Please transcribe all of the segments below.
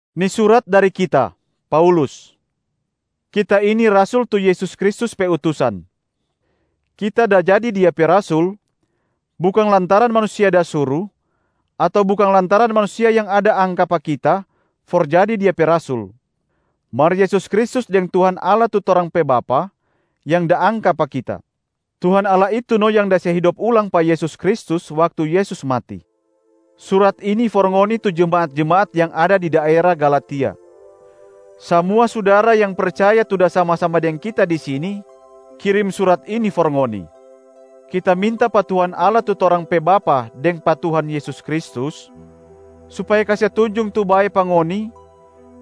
Ni surat dari kita, Paulus. Kita ini rasul tu Yesus Kristus pe utusan. Kita da jadi Dia pe rasul bukang lantaran manusia da suru ato bukang lantaran manusia yang da angka pa kita for jadi Dia pe rasul, mar Yesus Kristus deng Tuhan Allah tu torang pe Bapa yang da angka pa kita. Tuhan Allah itu no yang da se hidop ulang pa Yesus Kristus waktu Yesus mati. Surat ini for ngoni tu jemaat-jemaat yang ada di daera Galatia. Samua sudara yang percaya tu da sama-sama deng kita di sini kirim surat ini for ngoni. Kita minta pa Tuhan Allah tu torang pe Bapa deng pa Tuhan Yesus Kristus supaya kase tunjung tu bae pa ngoni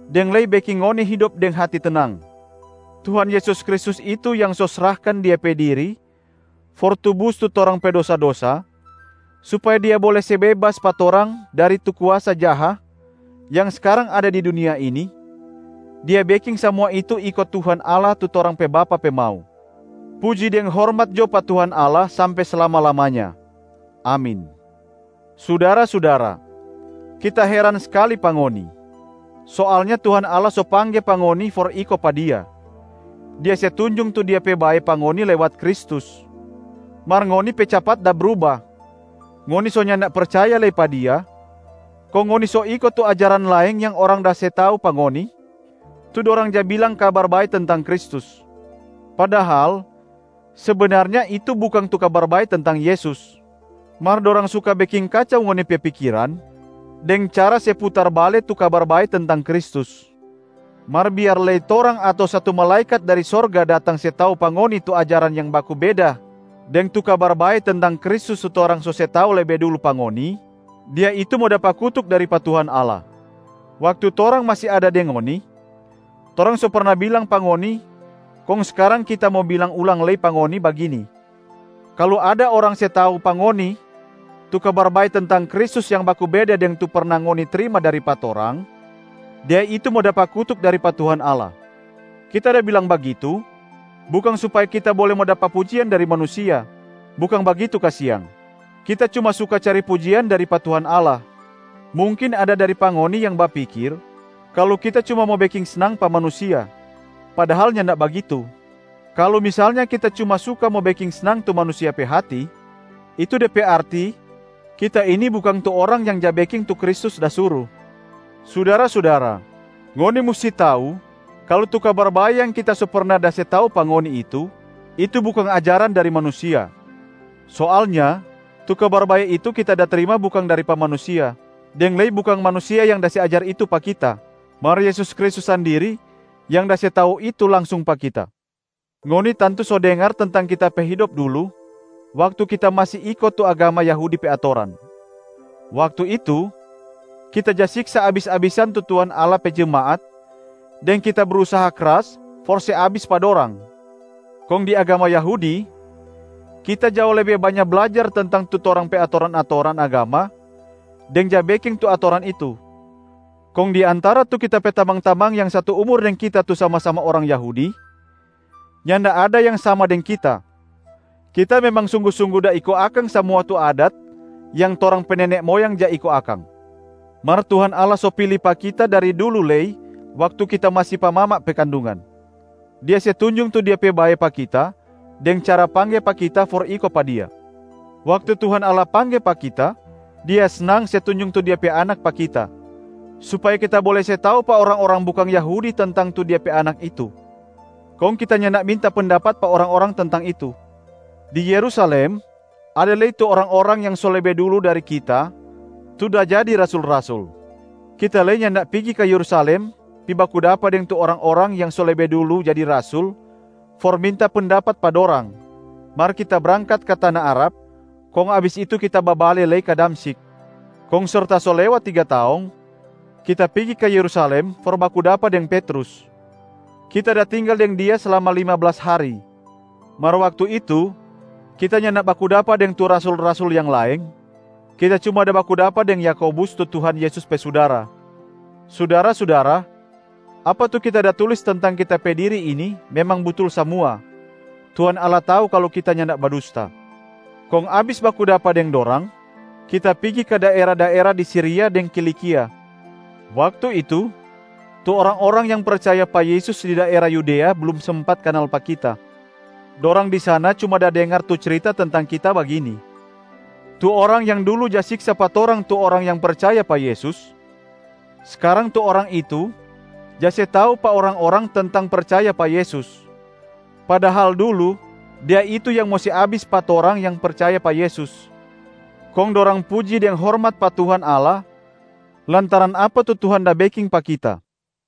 deng lei beking ngoni hidop deng hati tenang. Tuhan Yesus Kristus itu yang so srahkan Dia pe diri for tubus tu torang pe dosa-dosa supaya Dia bole se bebas pa torang dari tu kuasa jaha yang skarang ada di dunia ini, Dia beking samua itu iko Tuhan Allah tu torang pe Bapa pe mau. Puji deng hormat jo pa Tuhan Allah sampe slama-lamanya! Amin. Sudara-sudara, kita heran skali pa ngoni. Soalnya Tuhan Allah so pangge pa ngoni for iko pa Dia, Dia se tunjung tu Dia pe bae pa ngoni lewat Kristus. Mar ngoni pe capat da bruba, ngoni so nyanda percaya lei pa Dia, kong ngoni so iko tu ajaran laeng yang orang da se tau pa ngoni, tu dorang ja bilang kabar bae tentang Kristus. Padahal sebenarnya itu bukang tu Kabar Bae tentang Yesus. Mar dorang suka beking kacau ngoni pe pikiran deng cara se putar bale tu Kabar Bae tentang Kristus. Mar biar lei torang ato satu malaekat dari sorga datang se tau pa ngoni tu ajaran yang baku beda deng tu Kabar Bae tentang Kristus tu torang so se tau lebe dulu pa ngoni, dia itu mo dapa kutuk dari pa Tuhan Allah! Waktu torang masi ada deng ngoni, torang so perna bilang pa ngoni kong skarang kita mo bilang ulang lei pa ngoni bagini: kalu ada orang se tau pa ngoni tu kabar bae tentang Kristus yang baku beda deng tu perna ngoni trima dari pa torang, dia itu mo dapa kutuk dari pa Tuhan Allah. Kita da bilang bagitu, bukang supaya kita bole mo dapa pujian dari manusia, bukang bagitu kasiang, kita cuma suka cari pujian dari pa Tuhan Allah. Mungkin ada dari pa ngoni yang bapikir kalu kita cuma mo beking snang pa manusia, padahal nyanda bagitu. Kalu misalnya kita cuma suka mo beking snang tu manusia pe hati, itu de pe arti kita ini bukang tu orang yang ja beking tu Kristus da suru. Sudara-sudara, ngoni musti tau kalu tu Kabar Bae yang kita so perna da se tau pa ngoni itu, itu bukang ajaran dari manusia. Soalnya tu Kabar Bae itu kita da trima bukang dari pa manusia, deng lei bukang manusia yang da se ajar itu pa kita, mar Yesus Kristus sandiri yang da se tau itu langsung pa kita. Ngoni tantu so dengar tentang kita pe hidop dulu waktu kita masi iko tu agama Yahudi pe atoran. Waktu itu, kita ja siksa abis-abisan tu Tuhan Allah pe jemaat deng kita brusaha kras for se abis pa dorang. Kong di agama Yahudi, kita jao lebe banya blajar tentang tu torang pe atoran-atoran agama deng ja beking tu atoran itu. Kong di antara tu kita pe tamang-tamang yang satu umur deng kita tu sama-sama orang Yahudi, nyanda ada yang sama deng kita. Kita memang sunggu-sunggu da iko akang samua tu adat yang torang pe nene moyang ja iko akang. Mar Tuhan Allah so pili pa kita dari dulu lei waktu kita masi pa mama pe kandungan, Dia se tunjung tu Dia pe bae pa kita deng cara pangge pa kita for iko pa Dia. Waktu Tuhan Allah pangge pa kita, Dia snang se tunjung tu Dia pe Anak pa kita supaya kita bole se tau pa orang-orang bukang Yahudi tentang tu Dia pe Anak itu. Kong kita nyanda minta pendapat pa orang-orang tentang itu. Di Yerusalem, ada lei tu orang-orang yang so lebe dulu dari kita tu da jadi rasul-rasul. Kita lei nyanda pigi ka Yerusalem pi baku dapa deng tu orang-orang yang so lebe dulu jadi rasul for minta pendapat pa dorang, mar kita brangkat ka tana Arab, kong abis itu kita babale lei ka Damsyik. Kong serta so lewat tiga taong, kita pigi ka Yerusalem for baku dapa deng Petrus. Kita da tinggal deng dia slama lima blas hari. Mar waktu itu, kita nyanda baku dapa deng tu rasul-rasul yang laeng, kita cuma da baku dapa deng Yakobus tu Tuhan Yesus pe sudara. Sudara-sudara, apa tu kita da tulis tentang kita pe diri ini memang butul samua, Tuhan Allah tau kalu kita nyanda badusta. Kong abis baku dapa deng dorang, kita pigi ka daera-daera di Siria deng Kilikia. Waktu itu, tu orang-orang yang percaya pa Yesus di daera Yudea blum sempat kanal pa kita. Dorang di sana cuma da dengar tu cirita tentang kita bagini, “Tu orang yang dulu ja siksa pa torang tu orang yang percaya pa Yesus, skarang tu orang itu ja se tau pa orang-orang tentang percaya pa Yesus, padahal dulu dia itu yang mo se abis pa torang yang percaya pa Yesus.” Kong dorang puji deng hormat pa Tuhan Allah lantaran apa tu Tuhan da beking pa kita.